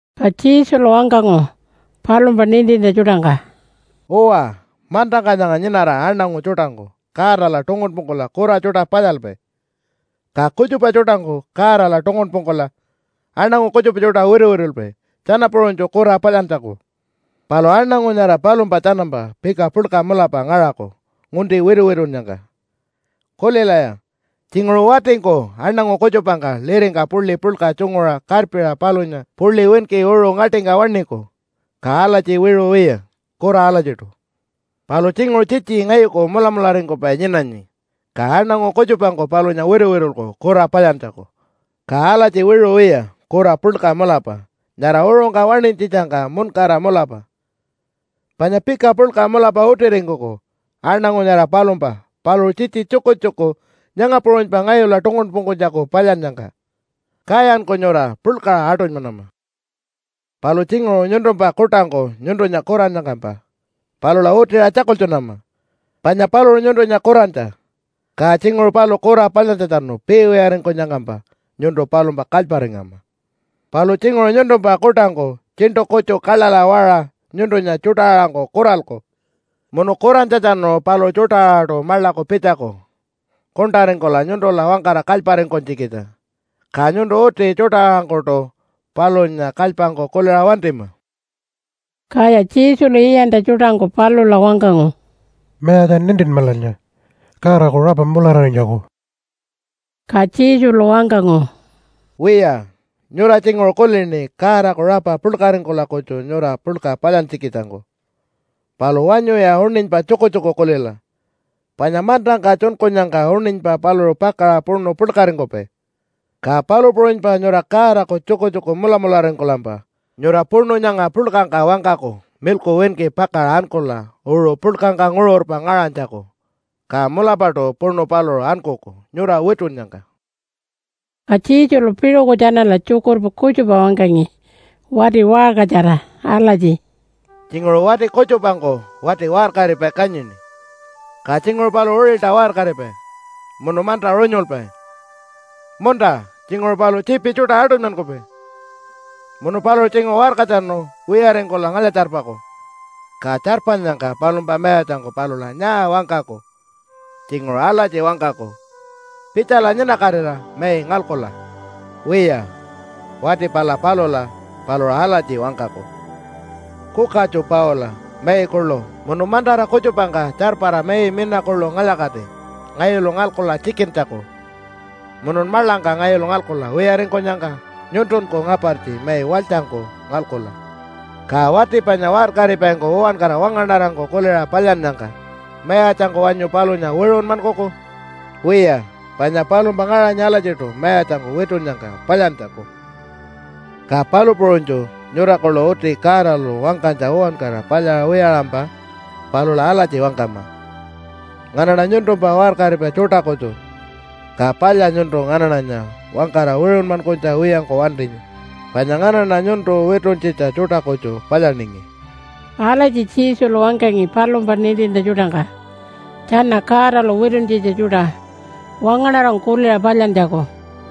Ka Jesulu wangkangu palumpa nintintja tjuṯangka, “Uwa, mantangka nyanga nyinara aṉangu tjuṯangku Godala tungunpungkula kura tjuṯa palyalpai. Ka kutjupa tjuṯangku Godala tungunpungkula aṉangu kutjupa tjuṯa wituwitulpai tjana puṟunytju kura palyantjaku. Palu aṉangu nyara palumpa tjanampa pika puḻka mulapa ngaṟaku ngunti wituwitunnyangka. Kulilaya! Tjinguṟu watingku aṉangu kutjupangka liringka puḻi puḻka tjunguṟa karpiṟa palunya puḻi winki uṟu ngaṯingka waṉiku, ka alatji wiṟu wiya, kura alatjiṯu. Palu tjinguṟu tjitji ngayuku mulamularingkupai nyinanyi, ka aṉangu kutjupangku palunya wituwitulku kura palyantjaku, ka alatji wiṟu wiya kura puḻka mulapa nyara uṟungka waṉinytjitjangka muṉkara mulapa. Panya pika puḻka mulapa utiringkuku aṉangu nyara palumpa paluṟu tjitji tjukutjuku nyanga puṟunypa ngayula tungunpungkunytjaku palyannyangka. Kayanku nyura puḻkaṟa aṯunymanama. “Palu tjinguṟu nyuntumpa kuṯangku nyuntunya kurannyangkampa palula utiṟa tjakultjunama panya paluṟu nyuntunya kurantja. Ka tjinguṟu paluṟu kura palyantjatjanu piiwiyaringkunyangkampa nyuntu palumpa kalyparingama. Palu tjinguṟu nyuntumpa kuṯangku tjiṉṯu kutju kaḻaḻa waṟa nyuntunya tjuṯa-aṟangku kuralku munu kurantjatjanu paluṟu tjuṯa-aṟaṯu maḻaku pitjaku kuṉṯaringkula nyuntula wangkara kalyparingkunytjikitja, ka nyuntu uti tjuṯa-aṟangkuṯu palunya kalypangku kuliṟa wantima.” Kaya Jesulu iyantja tjuṯangku palula wangkangu, “Mayatja, nintinmalanya Godaku rapa mulararinytjaku.” Ka Jesulu wangkangu, “Wiya, nyura tjinguṟu kulini Godaku rapa puḻkaringkula kutju nyura puḻka palyantjikitjangku. Palu wanyuya uṉinypa tjukutjuku kulila. Panya mantangka tjunkunyangka uṉinypa paluṟu pakaṟa puṉu puḻkaringkupai, ka palu puṟunypa nyura Godaku tjukutjuku mulamularingkulampa nyura puṉu nyanga puḻkangka wangkaku milku winki pakaṟa ankula uṟu puḻkangka nguṟurpa ngaṟanytjaku. Ka mulapaṯu puṉu paluṟu ankuku nyura witunnyangka.” Ka Jesulu piṟuku tjanala tjukurpa kutjupa wangkangi wati waṟkatjara alatji, “Tjinguṟu wati kutjupangku wati waṟkaripai kanyini. Ka tjinguṟu paluṟu uṟilta waṟkaripai munu manta runyulpai munta tjinguṟu paluṟu tjiipi tjuṯa aṯunymankupai, munu paluṟu tjinguṟu waṟkatjanu wiyaringkula ngalya-tjarpaku. Ka tjarpanyangka palumpa mayatjangku palula nyaa wangkaku? Tjinguṟu alatji wangkaku, ‘Pitjala nyinakatira mai ngalkula.’ Wiya, wati pala palula paluṟu alatji wangkaku, ‘Kukatju paula mai kuḻu munu mantara kutjupangka tjarpara mai mina kuḻu ngalya-kati ngayulu ngalkula tjikintjaku. Munun maḻangka ngayulu ngalkula wiyaringkunyangka nyuntunku ngapartji mai walytjangku ngalkula.’ Ka wati panya waṟkaripaingku uwankara wangaṉarangku kuliṟa palyannyangka mayatjangku wanyu palunya wiṟunmankuku? Wiya, panya palumpa ngaṟanyi alatjiṯu mayatjangku witunnyangka palyantjaku. “Ka palu puṟunytju nyura kuḻu uti Godalu wangkanytja uwankara palyaṟa wiyaṟampa palula alatji wangkama, ‘Nganaṉa nyuntumpa waṟkaripai tjuṯa kutju, ka palya nyuntu nganaṉanya wangkara wiṟunmankunytja wiyangku wantinyi, panya nganaṉa nyuntu wituntjitja tjuṯa kutju palyaningi.’” Alatji Jesulu wangkangi palumpa nintintja tjuṯangka tjana Godalu wituntjitja tjuṯa wangaṉarangku kuliṟa palyantjaku.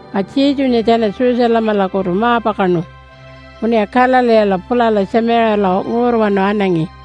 Ka Jesunya tjana Jerusalemalakutu ma-pakaṉu munuya Galileela pulala Tjamiṟiyala nguṟurwanu anangi.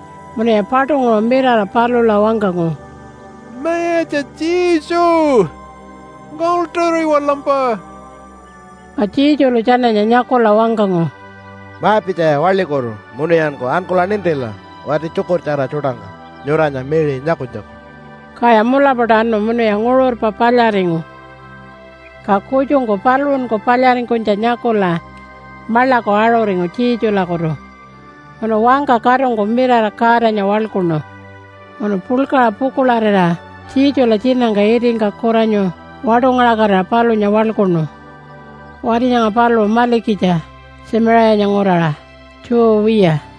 Munuya paṯunguṟu mirara palula wangkangu, “Mayatja Jesu! Ngaḻṯuriwalampa!” Ka Jesulu tjananya nyakula wangkangu, “Ma-pitjaya waḻikutu munuyanku ankula nintila wati tjukurtjara tjuṯangka nyuranya miṟi nyakunytjaku.” Kaya mulapaṯu anu munuya nguṟurpa palyaringu. Ka kutjungku paluṟunku palyaringkunytja nyakula maḻaku aṟuringu Jesulakutu munu wangka katungku mirara Godanya waḻkuṉu. Munu puḻkaṟa pukuḻarira Jesula tjinangka itingka kuranyu waṯungaṟakatira palunya waḻkuṉu. Wati nyanga paluṟu malikitja Tjamiṟiyanya nguraṟa, Jew wiya.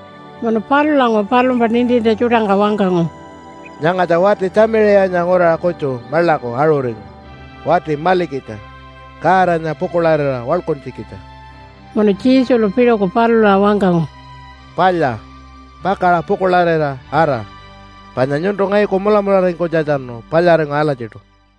Munu palulanguṟu palumpa nintintja tjuṯangka wangkangu, “Nyangatja wati Tjamiṟiyanya nguraṟa kutju maḻaku aṟuringu wati malikitja Godanya pukuḻarira waḻkuntjikitja.” Munu Jesulu piṟuku palula wangkangu, “Palya, pakaṟa pukuḻarira ara! Panya nyuntu ngayuku mulamularingkunytjatjanu palyaringu alatjiṯu.”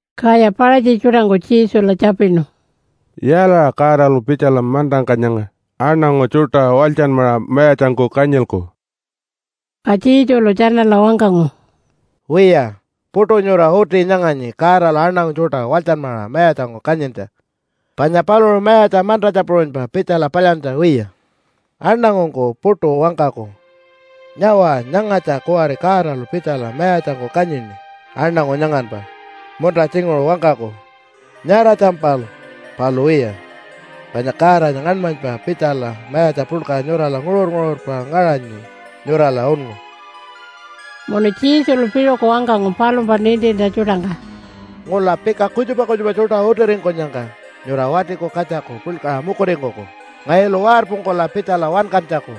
Kaya Paṟatji tjuṯangku Jesula tjapinu, “Yaalaṟa Godalu pitjala mantangka nyanga aṉangu tjuṯa walytjanmaṟa mayatjangku kanyilku?” Ka Jesulu tjanala wangkangu, “Wiya, puṯu nyura uti nyanganyi Godalu aṉangu tjuṯa walytjanmaṟa mayatjangku kanyintja, panya paluṟu mayatja mantatja puṟunypa pitjala palyantja wiya. Aṉangungku puṯu wangkaku, ‘Nyawa! Nyangatja kuwari Godalu pitjala mayatjangku kanyini aṉangu nyanganpa.’ Munta tjinguṟu wangkaku, ‘Nyaratjampal!’ Palu wiya, panya Godanya ngaṉmanypa pitjala mayatja puḻka nyurala nguṟur-nguṟurpa ngaṟanyi nyurala unngu.” Munu Jesulu piṟuku wangkangu palumpa nintintja tjuṯangka, “Ngula, pika kutjupa kutjupa tjuṯa utiringkunyangka nyura Watiku Katjaku puḻkaṟa mukuringkuku ngayulu warpungkula pitjala wankantjaku,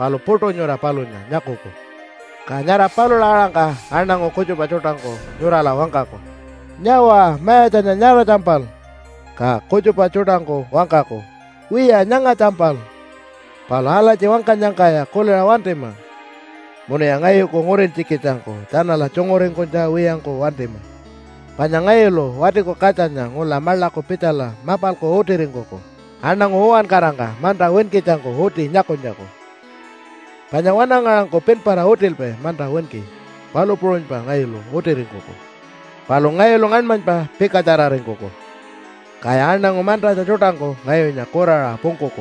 palu puṯu nyura palunya nyakuku. Ka nyara palula aṟangka aṉangu kutjupa tjuṯangku nyurala wangkaku, ‘Nyawa Mayatjanya nyaratjampal!’ Ka kutjupa tjuṯangku wangkaku, ‘Wiya, nyangatjampal!’ Palu alatji wangkanyangkaya kuliṟa wantima, munuya ngayuku ngurintjikitjangku tjanala tjunguringkunytja wiyangku wantima. Panya ngayulu Watiku Katjanya ngula maḻaku pitjala mapalku utiringkuku aṉangu uwankarangka manta winkitjangku uti nyakunytjaku. Panya wanangaṟangku pinpara utilpai manta winki, palu puṟunypa ngayulu utiringkuku. Palu ngayulu ngaṉmanypa pikatjararingkuku, kaya aṉangu mantatja tjuṯangku ngayunya kuraṟa pungkuku.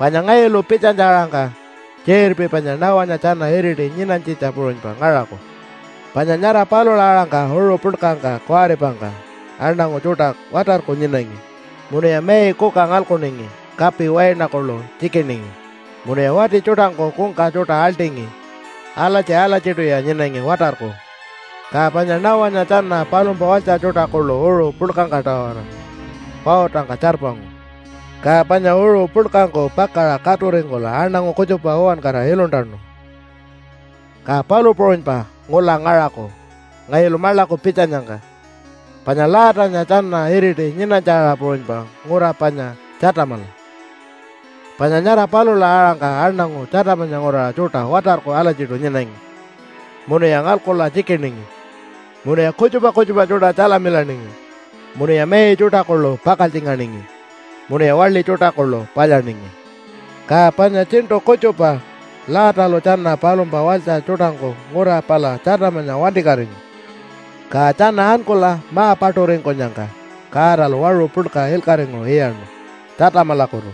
Panya ngayulu pitjanytja-aṟangka tjiṟirpi panya Noah-nya tjana iriti nyinanytjitja puṟunypa ngaṟaku. Panya nyara palula aṟangka uṟu puḻkangka kuwaripangka aṉangu tjuṯa watarku nyinangi, munuya mai kuka ngalkuningi, kapi waina kuḻu tjikiningi, munuya wati tjuṯangku kungka tjuṯa aḻṯingi. Alatji-alatjiṯuya nyinangi watarku, ka panya Noah-nya tjana palumpa walytja tjuṯa kuḻu uṟu puḻkangka-tawara pautangka tjarpangu, ka panya uṟu puḻkangku pakaṟa katuringkula aṉangu kutjupa uwankara iluntanu. “Ka palu puṟunypa ngula ngaṟaku ngayulu maḻaku pitjanyangka. Panya Lotanya tjana iriti nyinanytja-aṟa puṟunypa ngura panya Tjatamala. Panya nyara palula aṟangka aṉangu Tjatamanya nguraṟa tjuṯa watarku alatjiṯu nyinangi munuya ngalkula tjikiningi, munuya kutjupa kutjupa tjuṯa tjalamilaningi, munuya mai tjuṯa kuḻu pakaltjinganingi, munuya waḻi tjuṯa kuḻu palyaningi. Ka panya tjiṉṯu kutjupa Lotalu tjana palumpa walytja tjuṯangku ngura pala Tjatamanya wantikatingu, ka tjana ankula ma-paṯuringkunyangka Godalu waṟu puḻka ilkaṟinguṟu iyaṉu Tjatamalakutu,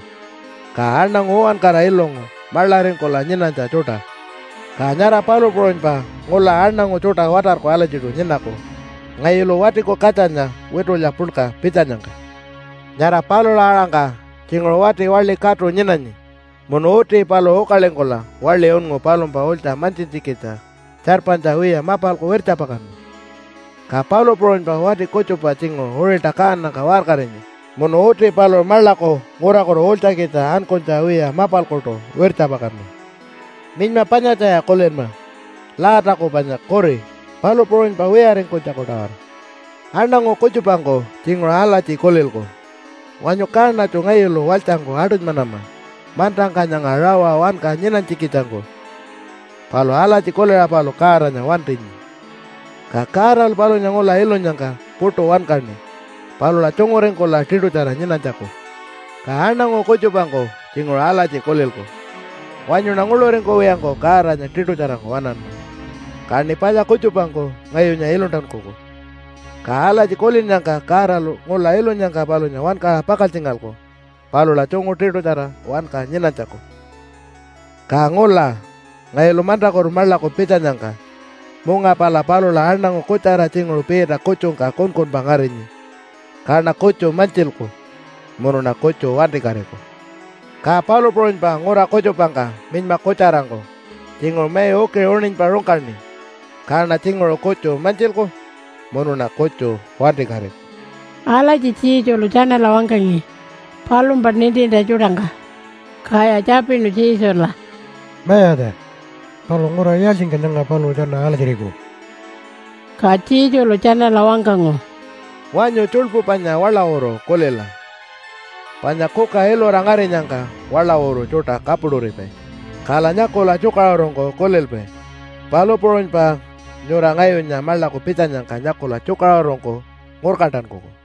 ka aṉangu uwankara ilungu maḻaringkula nyinanytja tjuṯa. Ka nyara palu puṟunypa ngula aṉangu tjuṯa watarku alatjiṯu nyinaku ngayulu Watiku Katjanya witulya puḻka pitjanyangka. Nyara palula aṟangka tjinguṟu wati waḻi katu nyinanyi munu uti paluṟu ukalingkula waḻi unngu palumpa ulytja mantjintjikitja tjarpanytja wiya mapalku wirtjapakanma. Ka palu puṟunypa wati kutjupa tjinguṟu uṟilta kaanangka waṟkarinyi munu uti paluṟu maḻaku ngurakutu ulytjakitja ankunytja wiya mapalkuṯu wirtjapakanma. Minyma panyatjaya kulinma, Lotaku panya kuri, palu puṟunypa wiyaringkunytjaku-tawara. Aṉangu kutjupangku tjinguṟu alatji kulilku, ‘Wanyu kaṉatju ngayulu walytjangku aṯunymanama mantangka nyanga rawa wanka nyinanytjikitjangku.’ Palu alatji kuliṟa paluṟu Godanya wantinyi, ka Godalu palunya ngula ilunyangka puṯu wankaṉi palula tjunguringkula tiṯutjara nyinanytjaku. Ka aṉangu kutjupangku tjinguṟu alatji kulilku, ‘Wanyuṉa nguḻuringkuwiyangku Godanya tiṯutjarangku waṉanma, kaṉi palya kutjupangku ngayunya iluntankuku.’ Ka alatji kulinnyangka Godalu ngula ilunyangka palunya wankaṟa pakaltjingalku palula tjungu tiṯutjara wanka nyinanytjaku. “Ka ngula ngayulu mantakutu maḻaku pitjanyangka munga pala palula aṉangu kutjara tjinguṟu piita kutjungka kunkunpa ngarinyi, kaṉa kutju mantjilku munuṉa kutju wantikatiku. Ka palu puṟunypa ngura kutjupangka minyma kutjarangku tjinguṟu mai ukiṟinguṟu uṉinypa rungkaṉi, kaṉa tjinguṟu kutju mantjilku munuṉa kutju wantikatiku.” Alatji Jesulu tjanala wangkangi palumpa nintintja tjuṯangka. Kaya tjapinu Jesula, “Mayatja, palu ngura yaaltjingka nyanga paluṟu tjana alatjiriku?” Ka Jesulu tjanala wangkangu, “Wanyu tjuḻpu panya waḻawuru kulila! Panya kuka ilura ngarinyangka waḻawuru tjuṯa kapuṯuripai. Kala nyakula tjukaṟurungku kulilpai. Palu puṟunypa nyura ngayunya maḻaku pitjanyangka nyakula tjukaṟurungku ngurkantankuku.”